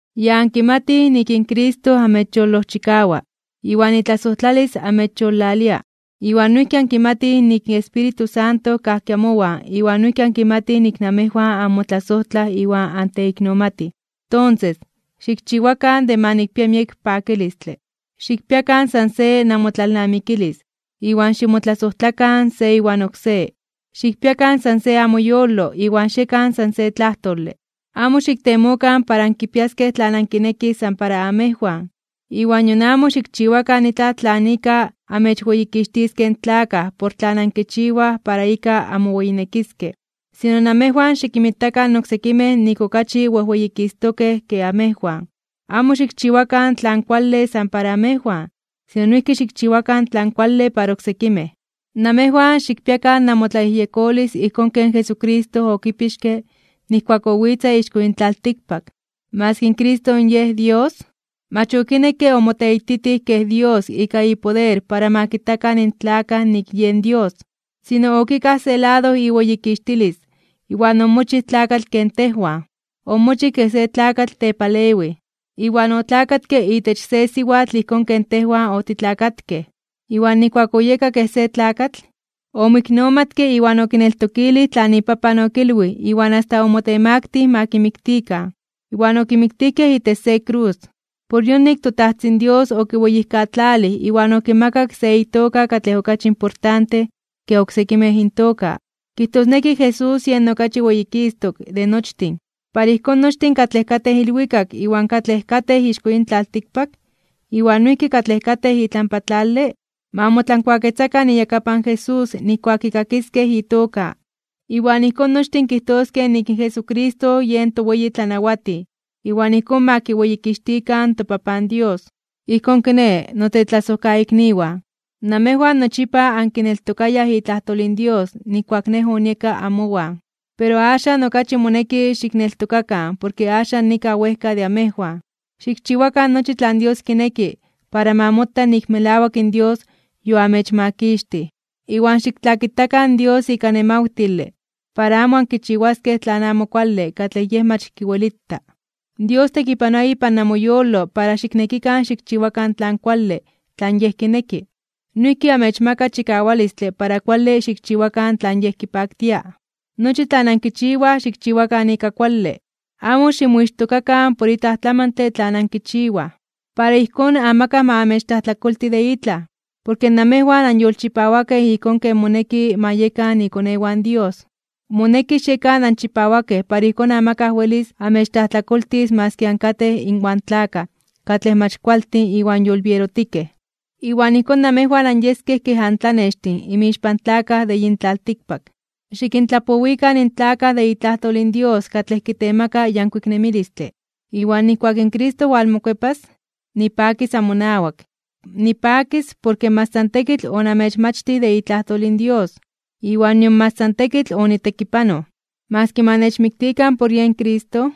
Ya ankimatij nik in Cristo amechyolojchikawa, iwan itlasojtlalis amechyolalia. Iwan noijki ankimatij nik in Espíritu Santo kajki amowan iwan noijki ankimatij nik namejwan anmotlasojtlaj iwan anteiknomatij. Tonses, xikchiwakan de ma nikpia miek pakilistle. Xikpiakan san se namotlalnamikilis iwan ximotlasojtlakan se iwan oksé. Xikpiakan san se amoyolo iwan xiekan san se tlajtole (de akuerdo). Amo xiktemokan para ankipiaskej tlan ankinekij san para amejwan, iwan nion amo xikchiwakan itlaj tlan ika amechweyikixtiskej in tlakaj por tlan ankichiwaj para ika anmoweyinekiskej. Sino namejwan xikinmitakan oksekimej nik okachi wejweyikistokej (wejweyititokej) ke amejwan. Amo xikchiwakan tlan kuale san para amejwan, sino noijki xikchiwakan tlan kuale para oksekimej. Namejwan xikpiakan namotlayejyekolis ijkón ken Jesucristo okipixke nijkuak owitza ixko yin tlaltikpak. Maski in Cristo Yej Dios, mach okinekke omoteititij kej Dios ika ipoder para ma kitakan in tlakaj nik yen Dios. Sino okikaj se lado iweyikixtilis iwan omochij tlakatl ken tejwan. Omochij kej se tlakatl tepalewij, iwan otlakatke itech se siwatl ijkón ken tejwan otitlakatkej. Iwan nijkuak oyeka kej se tlakatl, omoiknomatke iwan okineltokilij tlan iPapan okilwij iwan asta omotemaktij (omotemaktilij) para ma kimiktikan, iwan okimiktijkej itech se krus. Por yonik toTajtzin Dios okiweyijkatlalij iwan okimakak se itoka katlej okachi importante ke oksekimej intoka. Kijtosneki Jesús yen okachi weyikistok (weyititok) de nochtin. Para ijkón nochtin katlej katej ilwikak iwan katlej katej ixko yin tlaltikpak, iwan noijki katlej katej itlampa tlale, ma motlankuaketzakan iyakapan Jesús nijkuak kikakiskej itoka. Iwan ijkón nochtin kijtoskej nik in Jesucristo yen toweyiTlanawatij, iwan ijkón ma kiweyikixtikan toPapan Dios. Ijkón kiné, notetlasojkaikniwan, namejwan nochipa ankineltokayaj itlajtol in Dios nijkuak nej onieka amowan, pero axan okachi moneki xikneltokakan porke axan nikaj wejka de amejwan. Xikchiwakan nochi tlan Dios kineki para ma mota nik melawak in Dios yoamechmakixtij. Iwan xiktlakitakan in Dios ika nemawtile para amo ankichiwaskej tlan amo kuale katlej Yej mach kiwelita. Dios tekipanoa ipan namoyolo para xiknekikan xikchiwakan tlan kuale tlan Yej kineki. Noijki amechmaka chikawalistle para kuale xikchiwakan tlan Yej kipaktia. Nochi tlan ankichiwaj xikchiwakan ika kuale. Amo ximoixtokakan por itlaj tlamantle tlan ankichiwaj. Para ijkón amakaj ma amechtlajtlakolti de itlaj, porke namejwan anyolchipawakej ijkón ken moneki ma yekan ikonewan in Dios. Moneki xiekan anchipawakej para ijkón amakaj welis amechtlajtlakoltis maski ankatej inwan tlakaj katlej mach kualtin iwan yolbierotikej. Iwan ijkón namejwan anyeskej kej antlanextin inmixpan tlakaj de yin tlaltikpak. Xikintlapowikan in tlakaj de itlajtol in Dios katlej kitemaka yankuik nemilistle, iwan nijkuak in Cristo walmokuepas, nipakis amonawak. Nipakis porke mach san tekitl onamechmachtij de itlajtol in Dios, iwan nion mach san tekitl onitekipanoj. Maski ma nechmiktikan por yen Cristo,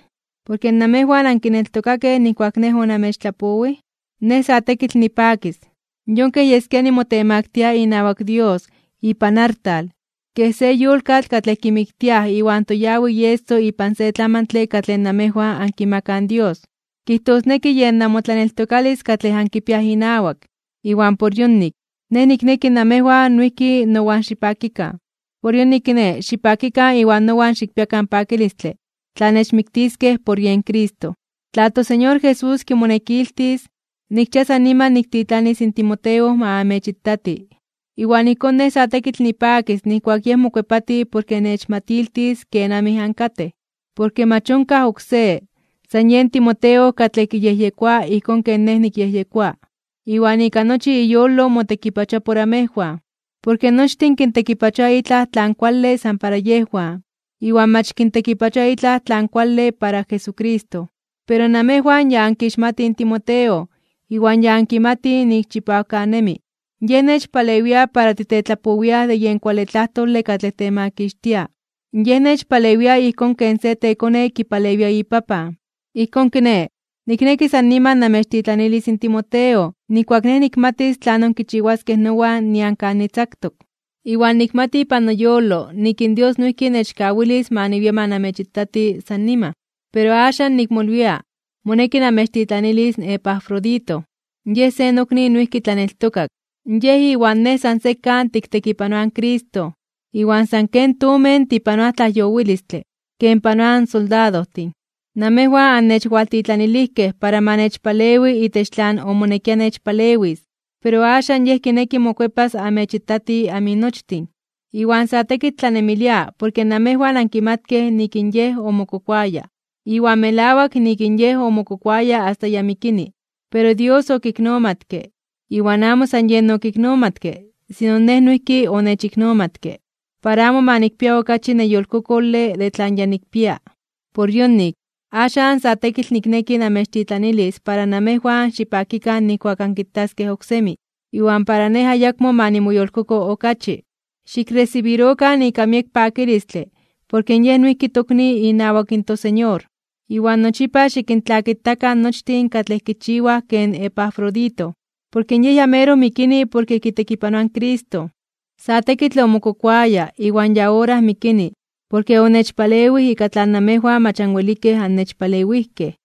porke namejwan ankineltokakej nijkuak nej onamechtlapowij, nej sa tekitl nipakis. Yon kej yeskia nimotemaktia (nimotemaktilia) inawak Dios ipan artal kej se yolkatl katlej kimiktiaj iwan toyawi ieso ipan se tlamantle katlej namejwan ankimakaj in Dios, kijtosneki yen namotlaneltokalis katlej ankipiaj inawak. Iwan por yonik, nej nikneki namejwan noijki nowan xipakikan. Por yonik, kiné, xipakikan iwan nowan xikpiakan pakilistle tla nechmiktiskej por yen Cristo. Tla toSeñor Jesús kimonekiltis, nikchia san niman niktitlanis in Timoteo ma amechitati. Iwan ijkón nej sa tekitl nipakis nijkuak yej mokuepati porke nechmatiltis kenamij ankatej. Porke mach onkaj oksé, san yen Timoteo katlej kiyejyekoa ijkón ken nej nikyejyekoa. Iwan ika nochi iyolo motekipachoa por amejwan. Porke nochtin kintekipachoa itlaj tlan kuale san para yejwan, iwan mach kintekipachoa itlaj tlan kuale para Jesucristo. Pero namejwan ya ankixmatij in Timoteo iwan ya ankimatij nik chipawkanemi. Yej nechpalewia para titetlapowiaj de yen kuale tlajtole katlej temakixtia, yej nechpalewia ijkón ken se tekone kipalewia ipapan. Ijkón kiné, nikneki san niman namechtitlanilis in Timoteo nijkuak nej nikmatis tlanon kichiwaskej nowan nian kan nitzaktok. Iwan nikmati ipan noyolo nik in Dios noijki nechkawilis ma niwia ma namechitati san niman. Pero axan nikmolwia moneki namechtitlanilis in Epafrodito. Yej se nokni noijki tlaneltokak, yej iwan nej san sekan tiktekipanoaj in Cristo, iwan san ken tomen tipanoaj tlajyowilistle ken panoaj in soldadojtin. Namejwan annechwaltitlanilijkej para ma nechpalewi itech tlan omonekia nechpalewis. Pero axan yej kineki mokuepas amechitati aminochtin, iwan sa tekitl tlanemilia porke namejwan ankimatkej nik in yej omokokoaya. Iwan melawak nik in yej omokokoaya asta ya mikini. Pero Dios okiknomatke, iwan amo san yen okiknomatke sino nej noijki onechiknomatke, para amo ma nikpia okachi neyolkokole de tlan ya nikpia. Por yonik, axan sa tekitl nikneki namechtitlanilis para namejwan xipakikan nijkuak ankitaskej oksemi, iwan para nej ayakmo ma nimoyolkoko okachi. Xikresibirokan ika miek pakilistle porke yej noijki tokni inawak in toSeñor. Iwan nochipa xikintlakitakan nochtin katlej kichiwaj ken Epafrodito. Porke yej ya meroj mikini porke kitekipanoa in Cristo. Sa tekitl omokokoaya iwan ya ora mikini porke onechpalewij ika tlan namejwan mach anwelikej annechpalewijkej.